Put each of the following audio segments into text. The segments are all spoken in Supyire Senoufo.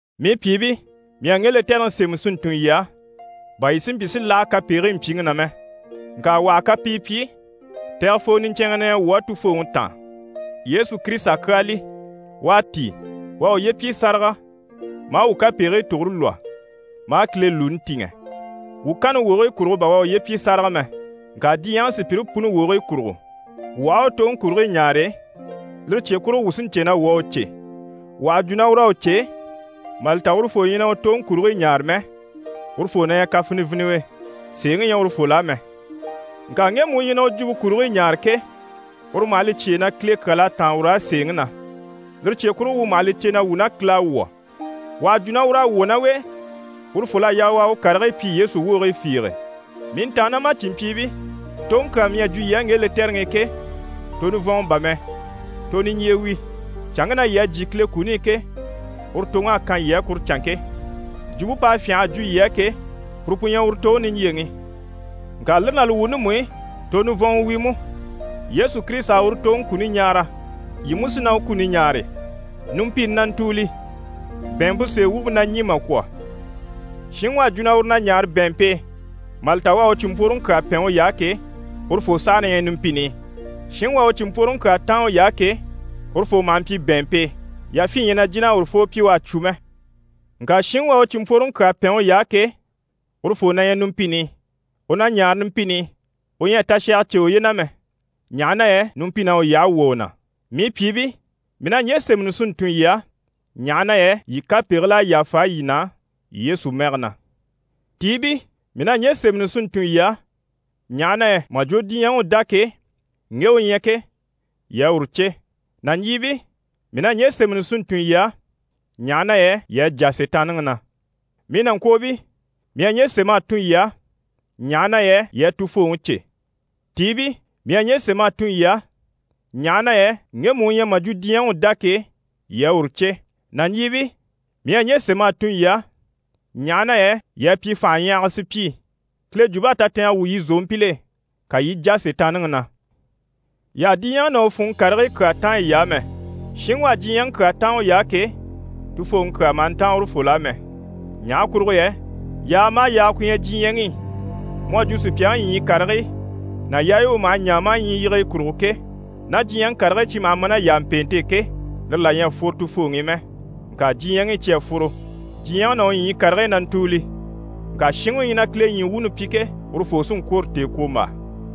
Mii pyìibii, mii à ŋge lɛtɛrɛŋi sémɛ si ntun yii á, bà yii si mpyi si láha kapegigii mpyiŋi na mɛ. Ŋka wà ha kapii pyi, tɛgɛfoo niɲcɛnŋɛ na ɲyɛ wuu á Tufooŋi taan, Yesu Kirisita kyaa li, u à tíi. U à uye pyi sáraga maa wuu kapegigii tugure lwɔ́ maa Kile lùuni tìŋɛ. Wuu kanni wogigii kurugo bà u à uye pyi sáraga mɛ, ŋka diɲyɛŋi sùpyire puni wogigii kurugo. Wuu aha a u toŋi kurigii ɲaare, lire cye kurugo wuu sí n‑cè na wuu à u cè. Wà ha jwo na ur'à u cè, mà li ta urufoo ɲyɛ na u toŋi kurigii ɲaare mɛ, urufoo na ɲyɛ kafiniviniwe, sèeŋi ɲyɛ urufol'á mɛ. Ŋka ŋgemu u ɲyɛ na u jwumpe kurigii ɲaare ke, uru maha li cyêe na Kile kyal'à táan ur'á sèeŋi na. Lire cye kurugo, wuu maha li cè na wuu ná Kile à wwɔ̀. Wà ha jwo na ur'à wwɔ̀ ná u e, urufol'à yaa u a u karigii pyi Yesu wogigii fiige. Mii ntàannamacinmpyiibii, toŋi kyaa mii à jwo yii á ŋge lɛtɛrɛŋi i ke, to nivɔnŋɔ bà mɛ. To niɲjye wi, canŋke na yii à jyè Kile kuni i ke, uru toŋ'à kan yii á kuru canŋke. Jwumpe p'à fyânha a jwo yii á ke, puru pu ɲyɛ uru toŋi niɲjyeŋi. Ŋka lire ná li wuuni mú i, to nivɔnŋɔ wi mú. Yesu Kirisita à uru toŋi kuni ɲaara, yii mú sí na u kuni ɲaare. Numpini na ntùuli, bɛ̀ɛnmpe sèe wumpe na ɲî mà kwɔ̀. Shinŋi u à jwo na uru na ɲaare bɛ̀ɛnmpe e, mà li ta u à u cìnmpworoŋi kyaa pɛn uy'á ke, urufoo saha na ɲyɛ numpini i. Shinŋi u à u cìnmpworoŋi kyaa táan uy'á ke, urufoo maha mpyi bɛ̀ɛnmpe e, yafyin ɲyɛ na jìn'a urufoo pyi u à cwo mɛ. Ŋka shinŋi u à u cìnmpworoŋi kyaa pɛn uy'á ke, urufoo na ɲyɛ numpini i, u na ɲaare numpini i, u ɲyɛ a tashaga cè uye na mɛ, ɲaha na yɛ numpin'à u yyahe wwɔ̀ u na. Mii pyìibii, mii na ɲje sémɛni si ntun yii á, ɲaha na yɛ yii kapegigil'à yàfa yii na Yesu mɛge na. Tiibii, mii na ɲje sémɛni si ntun yii á, ɲaha na yɛ mà jwo diɲyɛŋi u dá ke, ŋgemu u ɲyɛ ke, yii à uru cè. Nàɲjiibii, mii na ɲje sémɛni si ntun yii á, ɲaha na yɛ yii à jà Sitaanniŋi na. Mii nàŋkwoobii, mii à ɲje sém'a tun yii á, ɲaha na yɛ yii à Tufooŋi cè. Tiibii, mii à ɲje sém'a tun yii á, ɲaha na yɛ ŋgemu u ɲyɛ mà jwo diɲyɛŋi u dá ke, yii à uru cè. Nàɲjiibii, mii à ɲje sém'a tun yii á, ɲaha na yɛ yii à pyi fànhaɲyahaga sùpyii. Kile jwump'à tatɛɛngɛ wwû yii zòompil'e, ka yii i jà Sitaanniŋi na. Yii àha diɲyɛŋi ná u funŋɔ karigii kyaa táan yiy'á mɛ. Shinŋi u à diɲyɛŋi kyaa táan uy'á ke, Tufooŋi kyaa maha ntáan urufol'á mɛ. Ɲaha kurugo yɛ yaaga maha yaaga ku ɲyɛ diɲyɛŋi i mu à jwo sùpyaŋi ɲyii karigii ná yaayi u maha ɲaa maa ɲyii yige yi kurugo ke, ná diɲyɛŋi karigii cyi maha ma ná yàmpeente e ke, lire là ɲyɛ a fworo Tufooŋi i mɛ, ŋka diɲyɛŋi i cyi à fworo. Diɲyɛŋi ná u ɲyii karigii na ntùuli. Ŋka shinŋi u ɲyɛ na Kile ɲyii wuuni pyi ke, urufoo sí n‑kwôro tèekwombaa.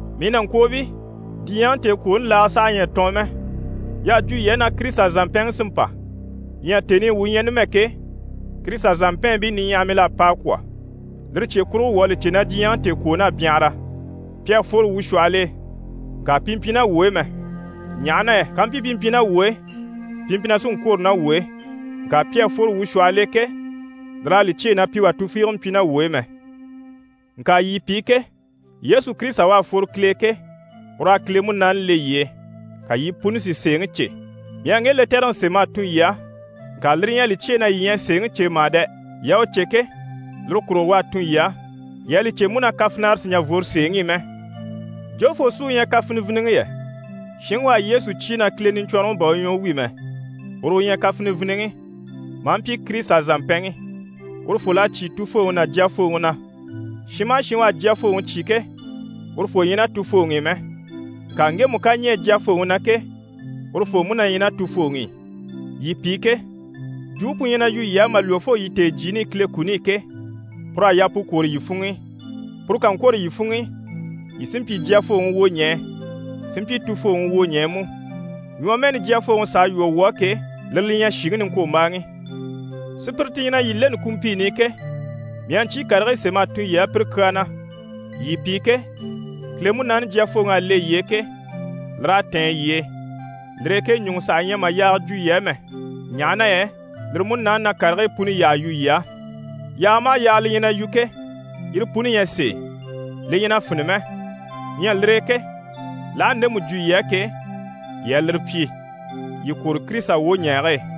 Mii nàŋkwoobii, diɲyɛŋi tèekwooni laaga saha ɲyɛ a tɔɔn mɛ. Y'à jwo yii á na Kirisita zàmpɛnŋi sí n‑pa. Ɲyɛ tèni i wuu ɲyɛ numɛ ke, Kirisita zàmpɛɛnbii niɲyahamil'à pa a kwɔ̀. Lire cye kurugo wuu à li cè na diɲyɛŋi tèekwoon'à byanhara. Pi à fworo wuu shwɔhɔl'e, ŋka pi mpyi ná wuu e mɛ, ɲaha na yɛ kàmpyi pi mpyi ná wuu e, pi mpyi na sí n‑kwôro ná wuu e. Ŋka pi à fworo wuu shwɔhɔl'e ke, lir'à li cyêe na pi wà tufiige mpyi ná wuu e mɛ. Ŋka yii pi ke, Yesu Kirisita u à fworo Kile e ke, ur'à Kile Munaani le yii e, ka yii puni si sèeŋi cè. Mii à ŋge lɛtɛrɛŋi sém'a tun yii á, ŋka lire ɲyɛ a li cyêe na yii ɲyɛ a sèeŋi cè mà dɛ! Yii à u cè ke, lire kurugo u à tun yii á. Yii à li cè mú na kafinara sì n‑jà n‑fworo sèeŋi i mɛ. Jofoo sí u ɲyɛ kafiniviniŋi yɛ? Shinŋi u à Yesu cyé na Kile Niɲcwɔnrɔŋi bà u ɲyɛ u wi mɛ, uru u ɲyɛ kafiniviniŋi, maa mpyi Kirisita zàmpɛnŋi. Urufol'à cyé Tufooŋi ná Jyafooŋi na. Shin maha shin u à Jyafooŋi cyé ke, urufoo ɲyɛ ná Tufooŋi i mɛ. Ŋka ŋgemu ká ɲɛɛ Jyafooŋi na ke, urufoo mú na ɲyɛ ná Tufooŋi i. Yii pi ke, jwumpe pu ɲyɛ na yu yii á mà lwɔ́ fo yii tèejyiini i Kile kuni i ke, pur'à yaa pu kwôro yii funŋ'i. Puru ká ŋkwôro yii funŋ'i, yii sí n‑pyi Jyafooŋi wwoɲɛɛ, sí n‑pyi Tufooŋi wwoɲɛɛ mú. Ɲwɔmɛɛni Jyafooŋi s'à lwɔ́ wuu á ke, lire li ɲyɛ: shìŋi niŋkwombaaŋi. Sùpyire ti ɲyɛ na yii leni kumpiini i ke, mii à ɲcyii karigii sém'a tun yii á pire kyaa na. Yii pi ke, Kile Munaani Jyafooŋi à le yii e ke, lir'à tɛ̀ɛn yii e. Lire e ke ɲùŋɔ saha ɲyɛ mà yaaga jwo yii á mɛ, ɲaha na yɛ lire Munaani na karigii puni yyaha yu yii á. Yaaga maha yaaga li ɲyɛ na yu ke, yire puni ɲyɛ sèe, li ɲyɛ na fini mɛ. Ɲyɛ lire e ke, l'aha ndemu jwo yii á ke, yii a lire pyi. Yii kwôro Kirisita wwoɲɛɛge e.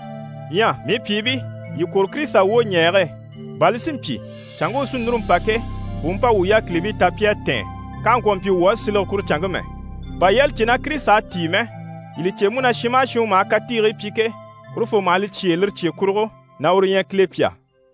Ɲyɛ mii pyìibii, yii kwôro Kirisita wwoɲɛɛge e, bà li si mpyi, canŋke u sí núru n‑pa ke, u u mpa wuu yákilibii ta pi à tɛ̀ɛn, k'àha ŋkwɔ̀ mpyi wuu á silege kuru canŋke mɛ. Bà yii à li cè na Kirisita à tíi mɛ, yii li cè mú na shin maha shin u maha katiigii pyi ke, urufoo maha li cyêe lire cye kurugo na uru ɲyɛ Kile pyà.